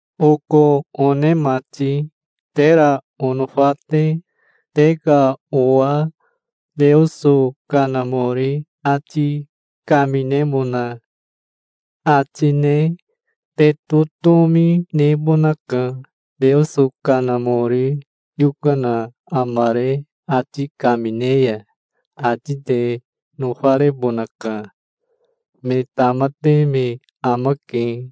Oko one mati, tera onofa te, te ka owa Teoso Kanamori ati kaminemona ati ne te totomi nebonaka. Teoso Kanamori yokana amare ati kamine ya ati te nofarebonaka. Me tamate me amake,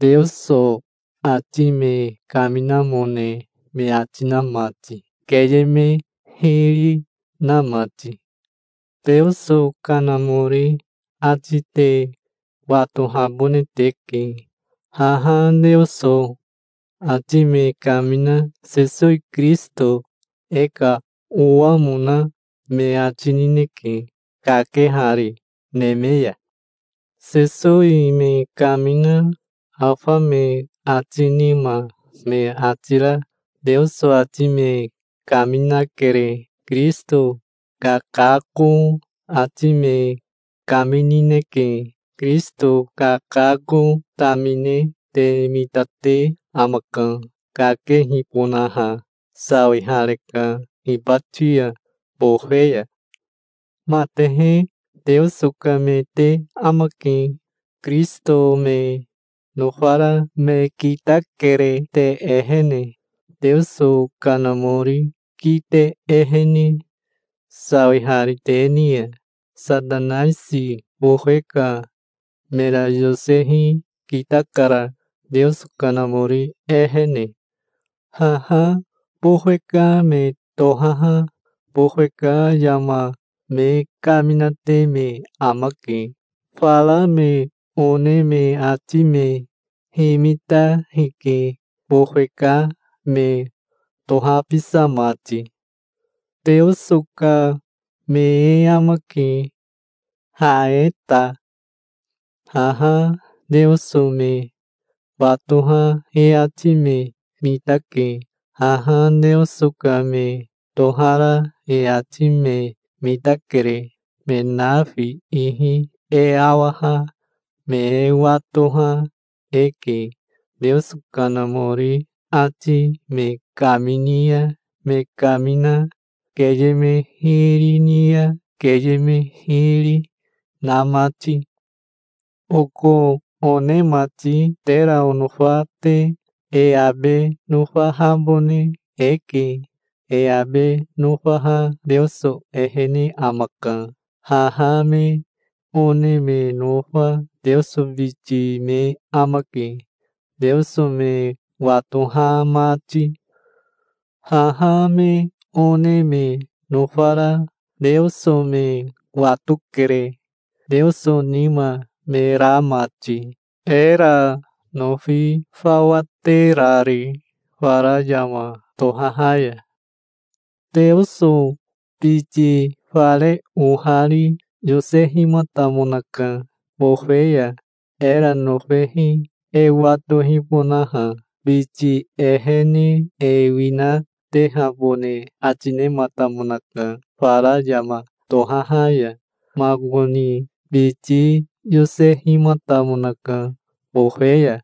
Teoso ati me kaminamone me ati na mati, keye me hiri na mati. Teoso Kanamori ati te watohabone teke. Haha Teoso ati me kamina Sesowi Kirisito e ka owamona me ati nineke, kakehari neme ya. Sesowi me kamina afa me ati nima me ati ra Teoso ati me kaminakere. Kirisito kakako ati me kaminineke. Kirisito kakako tamine te mitate amaka, kakehibonaha. Sawihareka hibati ya bofe ya. Matehe Teoso ka me te amake. Kirisito me nofara me kitakere te ehene, Teoso Kanamori kite ehene, sawihari te ni ya. Satanaisi bofe ka mera yosehi kitakara, Teoso Kanamori ehene. Haha bofe ka me tohaha bofe ka yama me kaminate me amake. Fara me one me ati me himita hike, bofe ka me tohabisa mati. Teoso ka me e amake, ha e ta. Haha Teoso me watoha e ati me mitake. Haha Teoso ka me tohara e ati me mitakere. Me nafi ihi e awaha me e watoha eke, Teoso Kanamori ati me kamini ya me kamina, keye me hiri ni ya keye me hiri, na mati. Oko one mati, tera onofa te, e abe nofahabone eke. E abe nofaha Teoso ehene amaka. Haha me one me nofa Teoso biti me amake, Teoso me watoha mati. Haha me one me nofara Teoso me watokere, Teoso nima me ra mati, era nofi fawa terari fara yama tohaha ya. Teoso biti fare ohari yosehimatamonaka bofe ya, era nofehi e watohibonaha. Biti ehene e winatehabone ati nematamonaka fara yama tohaha ya. Makoni biti yosehimatamonaka bofe ya.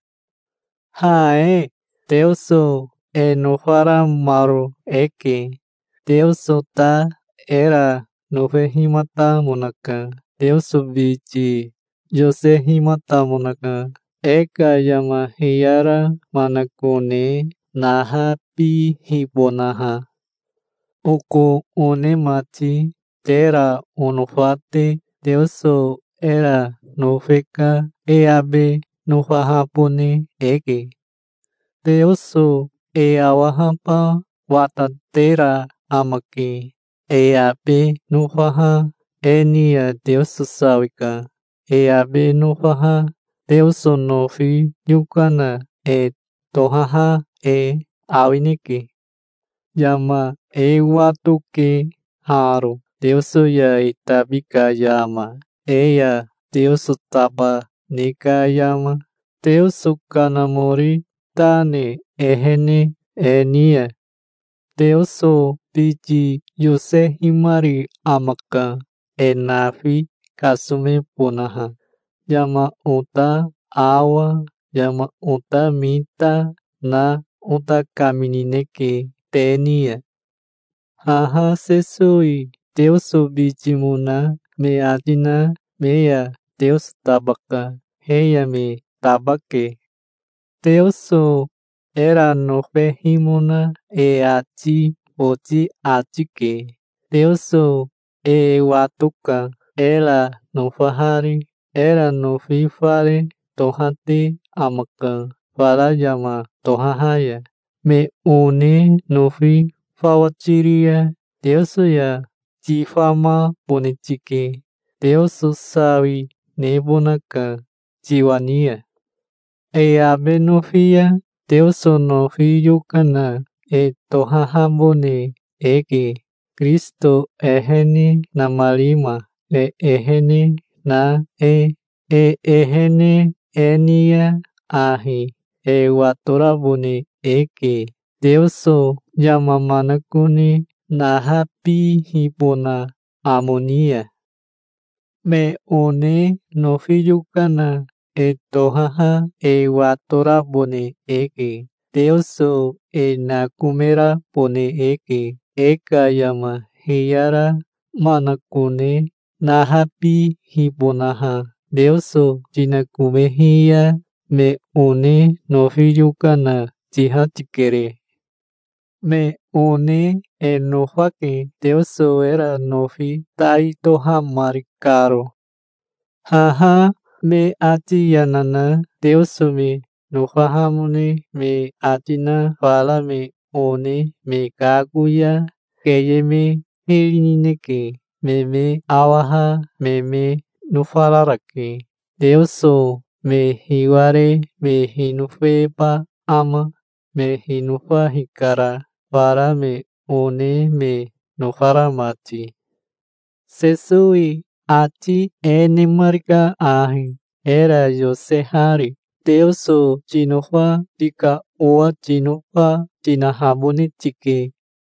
Ha e Teoso e nofaramaro eke. Teoso ta era nofehimatamonaka. Teoso biti yosehimatamonaka, e ka yama hiyara manakone nahabihibonaha. Oko one mati, tera onofa te, Teoso era nofe ka e abe nofahabone eke. Teoso e awahaba watatera amake. E abe nofaha e ni ya Teoso sawika. E abe nofaha Teoso nofi yokana e tohaha e awineke. Yama e watoke haro, Teoso ya e tabi ka yama, e ya Teoso taba ne ka yama, Teoso Kanamori ta ne ehene e ni ya. Teoso biti yosehimari amaka, e nafi kasomebonaha. Yama ota awa, yama ota mita na ota kaminineke te ni ya. Haha Sesowi Teoso bitimona me ati na me ya Teoso tabaka. He ya me taba, ke. Teoso era nofehimona e ati boti ati ke. Teoso e watoka, era nofahari. Era nofi fare tohate amaka fara yama tohaha ya. Me one nofi fawa tiri ya Teoso ya tifamabone tike. Teoso sawi nebonaka tiwa ni ya. E abe nofi ya Teoso nofi yokana e tohahabone eke, Kirisito ehene namarima e ehene na e. E ehene e ni ya ahi e watorabone eke, Teoso yama manakone nahabihibona amo ni ya. Me one nofi yokana e tohaha e watorabone eke. Teoso e nakomerabone eke, e ka yama hiyara manakone nahabihibonaha. Teoso tinakomehi ya me one nofi yokana tiha tikere. Me one e nofake, Teoso era nofi tai tohamari karo. Haha me ati yana na Teoso me nofahamone me ati na fara me one me kako ya keye me hiri nineke. Me me awaha me me nofararake. Teoso me hiware me hinofeba ama? Me hinofa hikara, fara me one me nofara mati. Sesowi ati e nemarika ahi, era yosehari: Teoso tinofa tika owa tinofa tinahabone tike.